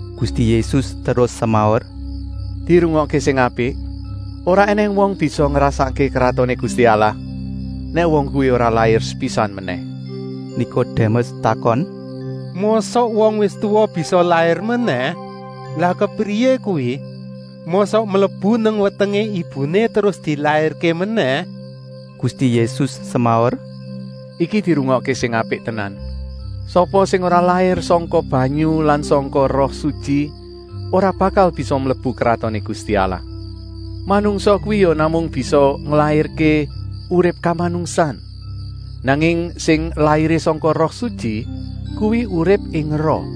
Gusti Yésus terus semaur: “Dirungokké sing apik: ora ènèng wong bisa ngrasakké Kratoné Gusti Allah, nèk wong kuwi ora lair sepisan menèh.” Nikodémes takon: “Mosok wong wis tuwa bisa lair menèh? Lah kepriyé kuwi? Mosok mlebu nang wetengé ibuné terus dilairké menèh?” Gusti Yésus semaur: “Iki dirungokké sing apik tenan! Sapa sing ora lair sangka banyu lan sangka Roh Sutyi ora bakal bisa mlebu Kratoné Gusti Allah. Manungsa kuwi ya namung bisa nglairké urip kamanungsan, nanging sing lairé sangka Roh Sutyi kuwi urip ing roh.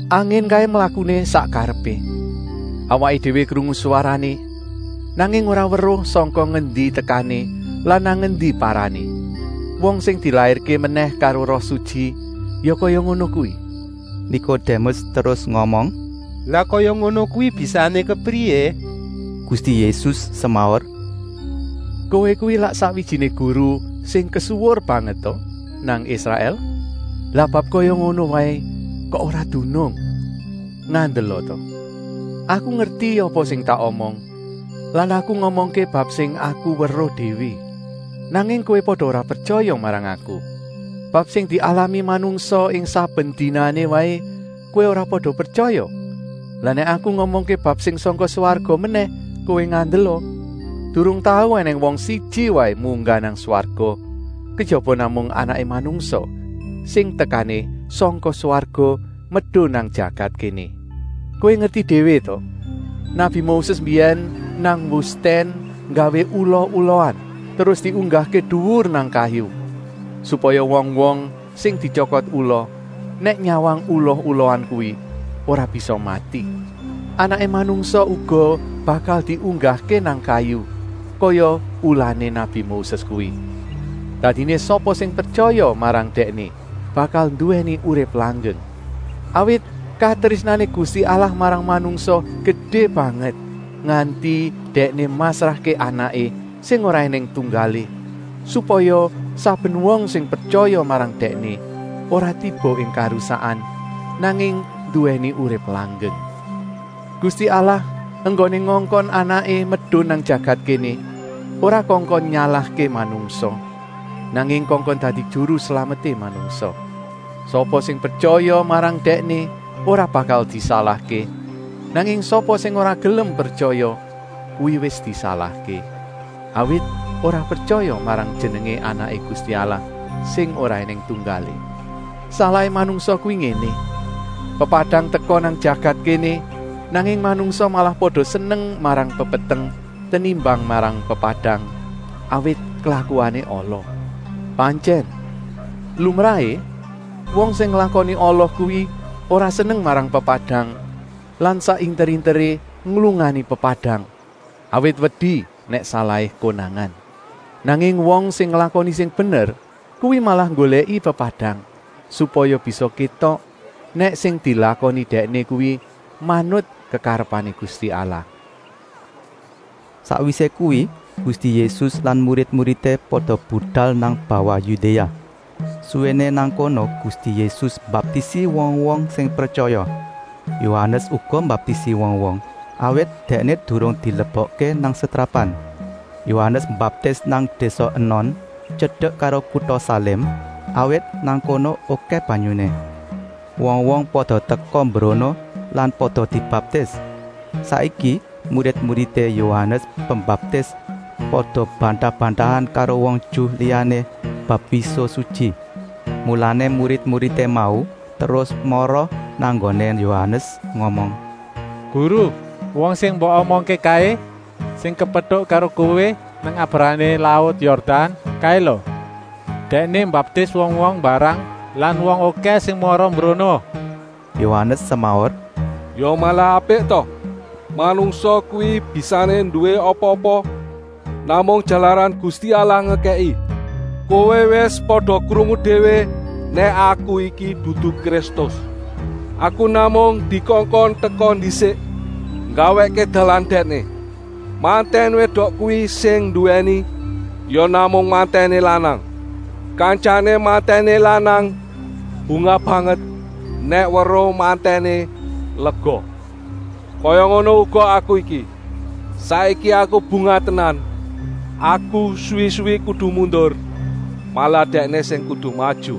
Angin kaé mlakuné sak karepé. Awaké déwé krungu swarané, nanging ora weruh sangka ngendi tekané lan nang endi parané. Wong sing dilairké menèh karo Roh Sutyi ya kaya ngono kuwi.” Nikodémes terus ngomong: “Lah kaya ngono kuwi bisané kepriyé?” Gusti Yésus semaur: “Kowé kuwi lak sakwijiné guru sing kesuwur banget ta nang Israèl? Lah bab kaya ngono waé kok ora dunung. Ngandela ta, Aku ngerti apa sing tak omong lan Aku ngomongké bab sing Aku weruh déwé. Nanging kowé pada ora pretyaya marang Aku. Bab sing dialami manungsa ing saben dinané waé kowé ora pada pretyaya, lah nèk Aku ngomongké bab sing sangka swarga menèh kowé ngandela! Durung tau ènèng wong siji waé munggah nang swarga, kejaba namung Anaké Manungsa sing tekané sangka swarga medun nang jagat kéné. “Kowé ngerti déwé ta, nabi Moses mbiyèn nang wustèn nggawé ula-ulaan terus diunggahké duwur nang kayu, supaya wong-wong sing dityokot ula nèk nyawang ula-ulaan kuwi ora bisa mati; Anaké Manungsa uga bakal diunggahké nang kayu, kaya ulané nabi Moses kuwi. Dadiné sapa sing pretyaya marang Dèkné bakal nduwèni urip langgeng. Awit katrésnané Gusti Allah marang manungsa gedé banget, nganti Dèkné masrahké Anaké sing ora ènèng tunggalé, supaya saben wong sing pretyaya marang Dèkné ora tiba ing karusakan, nanging nduwèni urip langgeng. Gusti Allah enggoné ngongkon Anaké medun nang jagat kéné ora kongkon nyalahké manungsa, nanging kongkon dadi Juru Slameté manungsa. “Sapa sing pretyaya marang Dèkné ora bakal disalahké, nanging sapa sing ora gelem pretyaya kuwi wis disalahké, awit ora pretyaya marang jenengé Anaké Gusti Allah sing ora ènèng tunggalé. Salahé manungsa kuwi ngéné: Pepadang teka nang jagat kéné, nanging manungsa malah pada seneng marang pepeteng tenimbang marang pepadang, awit klakuané ala. Pantyèn, lumrahé, wong sing nglakoni ala kuwi ora seneng marang pepadang lan sak inter-interé nglungani pepadang, awit wedi nèk salahé konangan. Nanging wong sing nglakoni sing bener kuwi malah nggolèki pepadang, supaya bisa kétok nèk sing dilakoni dèkné kuwi manut kekarepané Gusti Allah.” Sakwisé kuwi Gusti Yésus lan murid-muridé pada budal nang bawah Yudéa. Suwéné nang kono Gusti Yésus mbaptisi wong-wong sing pretyaya. Yohanes uga mbaptisi wong-wong, awit dèkné durung dilebokké nang setrapan. Yohanes mbaptis nang désa Enon, tyedek karo kuta Salim, awit nang kono okèh banyuné. Wong-wong pada teka mbrono lan pada dibaptis. Saiki murid-muridé Yohanes Pembaptis pada bantah-bantahan karo wong Ju liyané bab wisuh sutyi. Mulané murid-muridé mau terus mara nang nggoné Yohanes ngomong: “Guru, wong sing mbok omongké kaé, sing kepetuk karo kowé nang abrahané laut Yordan kaé lo, Dèkné mbaptis wong-wong mbarang lan wong okèh sing mara mbrono.” Yohanes semaur: “Ya malah apik ta? Manungsa kuwi bisané nduwé apa-apa namung jalaran Gusti Allah ngekèki. Kowé wis pada krungu déwé nèk aku iki dudu Kristus. Aku namung dikongkon teka ndisik nggawèkké dalan Dèkné. Mantèn wédok kuwi sing nduwèni ya namung mantèné lanang. Kantyané mantèné lanang bungah banget nèk weruh mantèné lega. Kaya ngono uga aku iki. Saiki aku bungah tenan. Aku suwi-suwi kudu mundur, malah Dèkné sing kudu maju.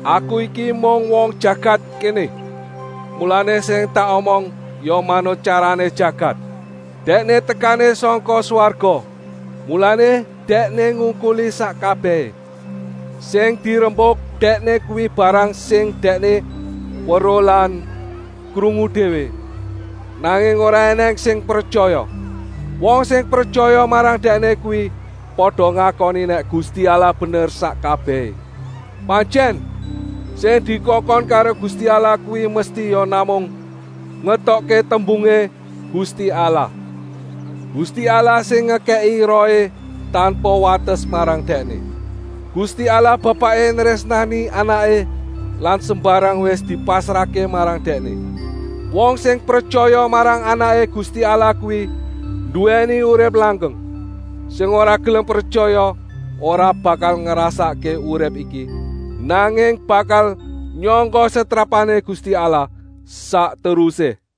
“Aku iki mung wong jagat kéné, mulané sing tak omong ya manut tyarané jagat. Dèkné tekané sangka swarga, mulané Dèkné ngungkuli sak kabèhé. Sing dirembuk Dèkné kuwi barang sing Dèkné weruh lan krungu déwé, nanging ora ènèng sing pretyaya. Wong sing pretyaya marang Dèkné kuwi pada ngakoni nèk Gusti Allah bener sak kabèhé. Pantyèn, sing dikongkon karo Gusti Allah kuwi mesti ya namung ngetokké tembungé Gusti Allah. Gusti Allah sing ngekèki Rohé tanpa wates marang Dèkné. Gusti Allah Bapaké nrésnani Anaké lan sembarang wis dipasrahké marang Dèkné. Wong sing pretyaya marang Anaké Gusti Allah kuwi nduwèni urip langgeng, sing ora gelem pretyaya ora bakal ngrasakké urip iki, nanging bakal nyangga setrapané Gusti Allah sak terusé.”